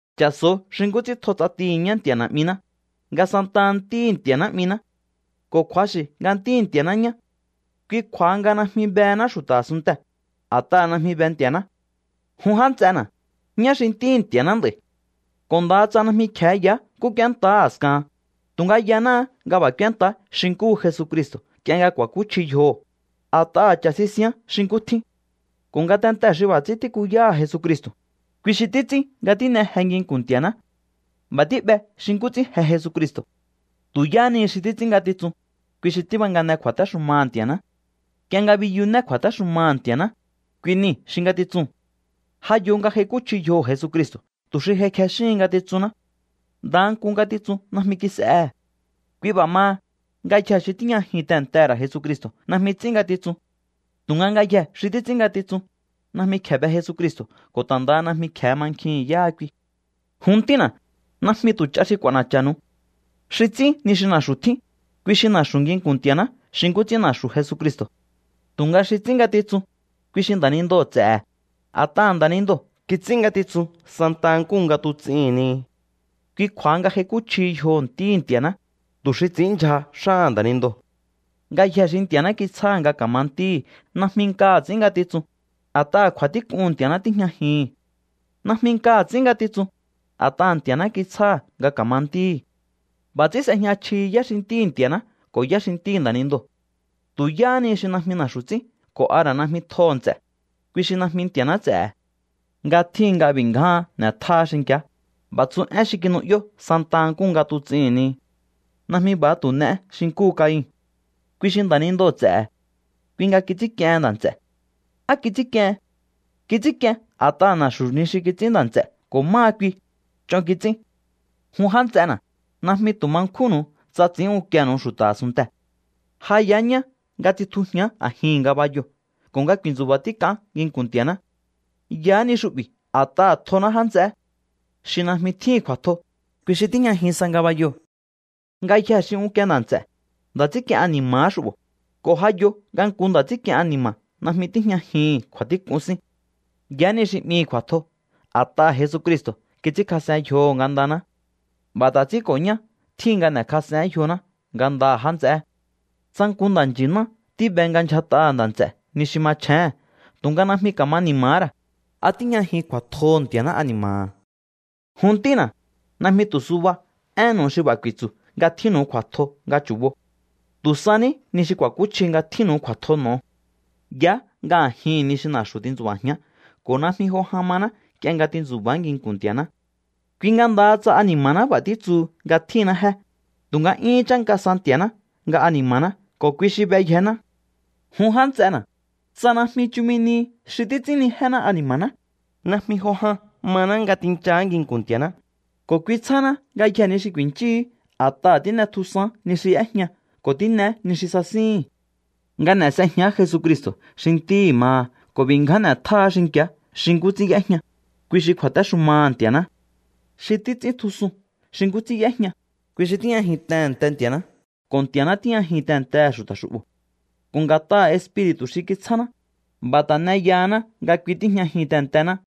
Cha̱so̱o xi nkú ts'ín tjo ts'atihi̱ ñá Nti̱a̱ Na̱'miná, nga santaha ntíhi̱ Nti̱a̱ná 'miná. Ko̱ kju̱axi̱ nga ntíhi̱ Nti̱a̱ná ñá. Kui kju̱a̱ha nga najmi behená xu̱ta̱ a̱sunntee̱, a̱t'aha̱ najmi be Nti̱a̱ná. Jun já nts'ena̱, ñá xi ntíhi̱ Nti̱a̱ná nd'a̱i̱. Ko̱ ndaha tsa najmi kje̱e yaá nkú k'úéntaá a̱skahan, tu̱nga yanáá nga b'a̱ k'úéntaá xi nkúhu Jesucristo̱ nk'ie nga kj'u̱a̱íkúchji yjoho̱, a̱t'aha̱ cha̱ sisián xi nkú tjín. Ko̱ ngatentee̱ xi b'a̱ ts'ín tíkuyáha̱ Jesucristo̱, kui xi títs'ín nga tín'e je nginku̱n Nti̱a̱ná. B'a̱ tí'be xi nkú ts'ín je Jesucristo̱. Tu̱ yáha ni xi títs'ín ngatitsun, kui xi tíbangane kju̱a̱téxumaha̱ Nti̱a̱ná. Nk'ie nga biyuné kju̱a̱téxumaha̱ Nti̱a̱ná, kui nii̱ xi ngatitsuu̱n. Ja yo nga j'aikúchji yjoho̱ Jesucristo̱ tu̱ xi j'aikjexíhin ngatitsunná. Ndaha nku ngatitsun najmi kis'ehe̱. Kui b'a̱ maha, ngayjee̱ xi tíjñajin tehe̱ntehe̱ ra̱ Jesucristo̱ najmi ts'ín ngatitsun. Tu̱nga ngayjee̱ xi títs'ín ngatitsun, najmi kje̱e be Jesucristo̱ ko̱ ta̱ ndaha najmi kje̱e mankjihi̱n yáha kui. Jun ntína̱, najmi tu̱ ch'a xi k'u̱a̱na̱cha̱nu̱u. Xi ts'ín ni xi na̱xu̱ tjín, kui xi na̱xu̱ nginku̱n Nti̱a̱ná xi nkú ts'ín na̱xu̱ Jesucristo̱. Tu̱nga xi ts'ín ngatitsun, kui xi nda̱nindoo̱ ts'e̱he̱, a̱t'aha̱ nda̱nindoo̱ kits'ín ngatitsun santaha nkúhu nga tuts'ihi̱n ni. Kui kju̱a̱ha nga j'aikúchjihi yjoho̱ Ntíhi̱ Nti̱a̱ná, tu̱ xi ts'i̱ínndyja xáha̱ nda̱nindoo̱. Ngayje̱e xi Nti̱a̱ná kitsjáha̱ nga ka̱ma ntíhi̱ najmi nkaha̱ ts'ín ngatitsun, a̱t'aha̱ kju̱a̱tík'uhu̱n Nti̱a̱ná tíjñajihi̱n. Najmi nkaha̱ ts'ín ngatitsun, a̱t'aha̱ Nti̱a̱ná kitsjáha̱ nga ka̱ma ntíhi̱. B'a̱ ts'ín s'ejña chjihi yá xi ntíhi̱ Nti̱a̱ná ko̱ yá xi ntíhi̱ nda̱nindoo̱. Tu̱ yáhá ni xi najmi na̱xu̱ ts'ín ko̱ a ra̱ najmi tjoho̱ nts'e̱, kui xi najmi Nti̱a̱ná ts'e̱he̱. Nga tjíhin nga b'i̱ ngjáán n'e̱tjáá xinki̱á, b'a̱ tsu én xi kinu'yó santaha nkúhu nga tuts'ihi̱n ni. Najmi b'a̱ha tu̱ n'eé xi nkúhu Cain. Kui xi nda̱nindoo̱ ts'e̱he̱. Kui nga kits'ínk'iehen nda̱ nts'e̱. ¿Á kits'ínk'iehen? Kits'ínk'ien a̱t'aha̱ na̱xu̱ ni xi kits'ín nda̱ nts'e̱ ko̱ máha kui, ch'on kits'ín. Jun já nts'ena̱, najmi tu̱ ma nkjúnnu̱u tsa ts'i̱ín unkienu̱u xu̱ta̱ a̱sunntee̱. Ja yaá ñá nga tsitjujián a̱jihi̱n ngabayoo̱ ko̱ nga ku̱i̱ntsu̱ba̱ tík'aán nginku̱n Nti̱a̱ná. Yaá ni xu'bi̱ a̱t'aha̱ tjoná já nts'eé. Xi najmi tjíhi̱n kju̱a̱tjo, kui xi tíjñajin sa ngabayoo̱. Ngayjee̱ xi unkie nda̱ nts'e̱, nda̱ts'ínk'ien ani̱ma̱há xu'bo̱, ko̱ ja yo nga nku nda̱ts'ínk'ien ani̱ma̱ najmi tíjñajihi̱n kju̱a̱tík'un sín. Yaá ni xi 'mihi̱ kju̱a̱tjo a̱t'aha̱ Jesucristo̱ kits'ínkjas'en yjoho̱ ngandaná. B'a̱ ta̱ ts'ín ko̱ ñá tjíhin nga n'e̱kjas'eén yjoná ngandaha̱ já nts'eé. Tsa nku nda̱nchi̱ná tíbe nga ndyjat'aha̱ nda̱ nts'e̱ ni xi machjéhe̱n tu̱nga najmi ka̱ma ni̱ma̱há ra̱, ¿a tíjñajin kju̱a̱tjoho̱ Nti̱a̱ná ani̱ma̱ha̱? Jun ntína̱, najmi tu̱ suba énnu̱u xi b'a̱ ku̱i̱tsu̱ nga tjínnu̱u kju̱a̱tjo nga chu̱bo. Tu̱ sa ní ni xi katakúchji nga tjínnu̱u kju̱a̱tjo n'o̱o. Yaá nga a̱jihi̱n ni xi na̱xu̱ tintsu̱ba̱jián ko̱ najmi jo jan maná nk'ie nga tintsu̱ba̱á nginku̱n Nti̱a̱ná. Kui nga ndaha tsa ani̱ma̱ná b'a̱ títsu nga tjínná jé, tu̱nga 'yúhún chánka sa Nti̱a̱ná nga ani̱ma̱ná ko̱ kui xi beyjená. Jun já nts'ena̱, tsa najmi chumi nihi xi títs'ínnijéná ani̱ma̱ná, najmi jo jan maná nga tinchaá nginku̱n Nti̱a̱ná, ko̱ kui tsjáná ngayjee̱ ni xi ku̱i̱nchíhi̱í, a̱t'aha̱ tín'etjusaán ni xi y'éjña ko̱ tín'eé ni xi sasíhi̱n. Nga n'e̱ s'ejián Jesucristo̱ xi Ntíhi̱ maha ko̱ nga b'i̱ ngján n'e̱tjáá xinki̱á xi nkú ts'ín y'éjña, kui xi kju̱a̱téxumaha̱ Nti̱a̱ná. Xi títs'íntjusun xi nkú ts'ín y'éjña, kui xi tíjñajin tehe̱nte Nti̱a̱ná ko̱ Nti̱a̱ná tíjñajin tehe̱ntehe̱ xu̱ta̱ xu'bo̱. Ko̱ nga̱t'aha̱ Espiri̱tu̱ xi kitsjáná, b'a̱ ta̱ n'e yahaná nga kui tíjñajin tehe̱ntená.